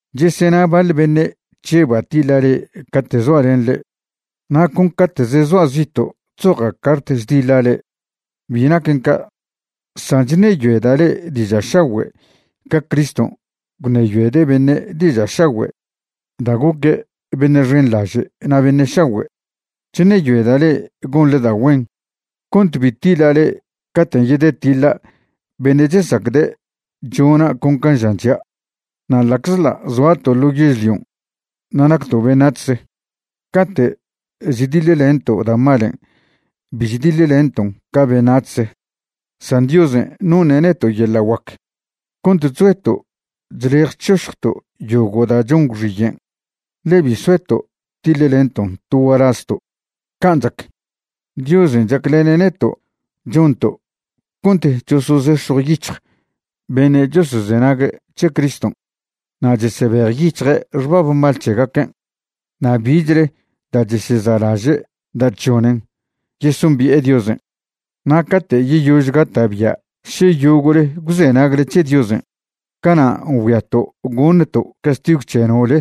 Chesena baḻ beṉe' chžeba' tiḻa' le'e cate' zoa' len le'e na' con cate'ze zoa' zito' chzoja' cart chdiḻa' le'e. Bi naquen ca', san chṉeyoeda' le'e diža' šagüe' ca Criston' gwṉeyoede' beṉe' diža' šagüe' da' goque' beṉe' xenḻaže' na' beṉe' šagüe'. Chṉeyoeda' le'e gonḻe da' güen cont bi tiḻa' le'e caten' yedetiḻa' beṉe' chesacde' chona' con can' žan c̱hia'. Na' ḻa'czḻa' zoato' ḻo yežlion' na' nacto' beṉac̱hze, cate' chdiḻlento' da' malen' bi chdiḻlenton' ca beṉac̱hze. San Diosen' noṉe' neto' yeḻa' guac cont chzoeto' chlej chšošjto' yogo' da' chon gwxiyen', ḻe bi soeto' tiḻlenton' to gualazto'. Can' chac, Diosen' chaclene' neto' chonto' cont chosozex̱jwyic̱hj beṉe' chosozenague' c̱he Criston' na' chesebejyic̱hje' xbab mal c̱hegaquen' na' bichle da' cheseza'laže' da' chžonen yesombi'e Diosen'. Na' cate' yeyož gata'bia' še yogo'le gwzenagle c̱he Diosen', cana' ngüiato' goṉto' castigw c̱he nole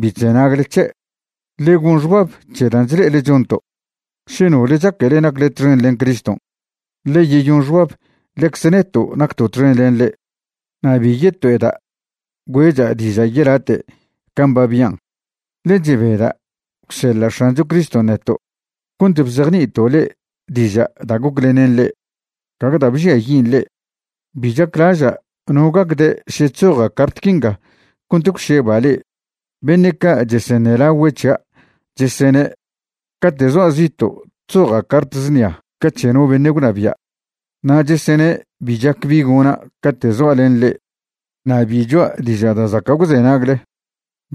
bi chzenagle c̱he'. Ḻe gon xbab c̱he dan' chle'ele chonto'. Še nole chaquele nacle txen len Criston', ḻe yeyon xbab ḻecze neto' nacto' txen len ḻe'. Na' bi yeto'eda' güe'cha' diža' yelate' can' ba bian', ḻe chebeda' gwseḻa' X̱ancho Criston' neto' cont bzejni'ito' le'e diža' da' goclenen le'e, gague da' bžiayin' le'e. Bi chaclaža' no gacde' še chzoja' cart quinga cont gwšeba' le'e. Beṉe' ca' cheseṉelagüe' c̱hia' chesene' cate' zoa' zito' chzoja' cart znia ca c̱he no beṉe' gwnabia', na' chesene' bi chac bi gona' cate' zoa' len le'e na' bi choa' diža' da' zaca' gwzenagle.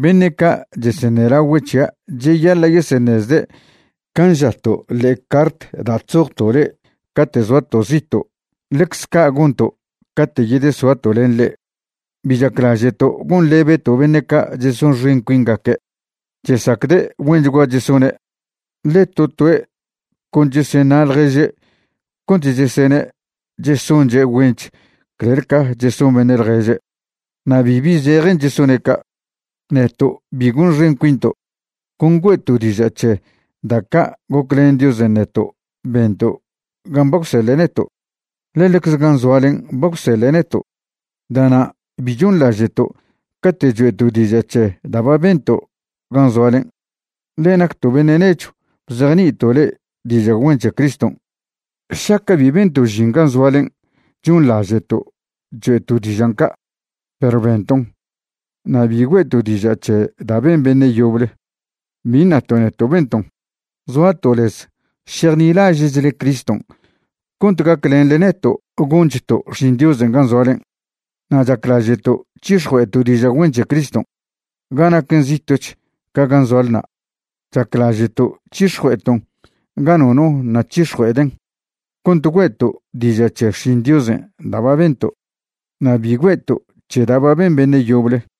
Beṉe' ca' cheseṉelagüe' c̱hia' cheyaḻa' yeseṉezde' can' žato' ḻe'e cart da' chzojto' le'e cate' zoato' zito', ḻecz ca' gonto' cate' yedesoato' len le'e. Bi chaclaže'to' gonḻebeto' beṉe' ca' chesonxen cuingaque'. Chesacde' güenchgua chesone', ḻe to toe' con cheseṉa' ḻježe' cont chesene' chesonche' güench clel ca cheson beṉe' ḻježe', na' bibi zejen chesone' ca'. Neto' bi gonxen cuinto'. Con güe'to' diža' c̱he da' ca' goclen Diosen' neto' bento' gan' ba gwseḻe' neto', ḻe ḻecze gan' zoalen' ba gwseḻe' neto'. Da'nan' bi chonḻaže'to' cate' choe'to' diža' c̱he da' ba bento' gan' zoalen', ḻe nacto' beṉe' nechw bzejni'ito' le'e diža' güen c̱he Criston'. Šaca' bi bento' žin gan' zoalen' chonḻaže'to' choe'to' dižan' ca', perw benton'. Na' bi güe'to' diža' c̱he da' ben beṉe' yoble, bi ṉato' neto' benton'. Zoato' lez šejnilaže'chle Criston' cont gaclenḻe neto' gonchto' xšin Diosen' gan' zoalen'. Na' chaclaže'to' c̱hix̱jue'eto' diža' güen c̱he Criston' ga naquen zito'ch ca gan' zoale na'. Chaclaže'to' c̱hix̱jue'eton' ga nono ṉa' c̱hix̱jue'eden' cont güe'to' diža' c̱he xšin Diosen' da' ba bento' na' bi güe'to' c̱he da' ba ben beṉe' yoble.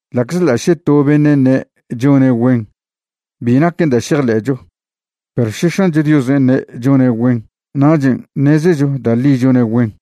Ḻa'czḻa' še to beṉe' ṉe' chone' güen, bi naquen da' šejḻe'cho. Perw še X̱ancho Diosen' ṉe' chone' güen nachen' ṉezecho da' ḻi chone' güen.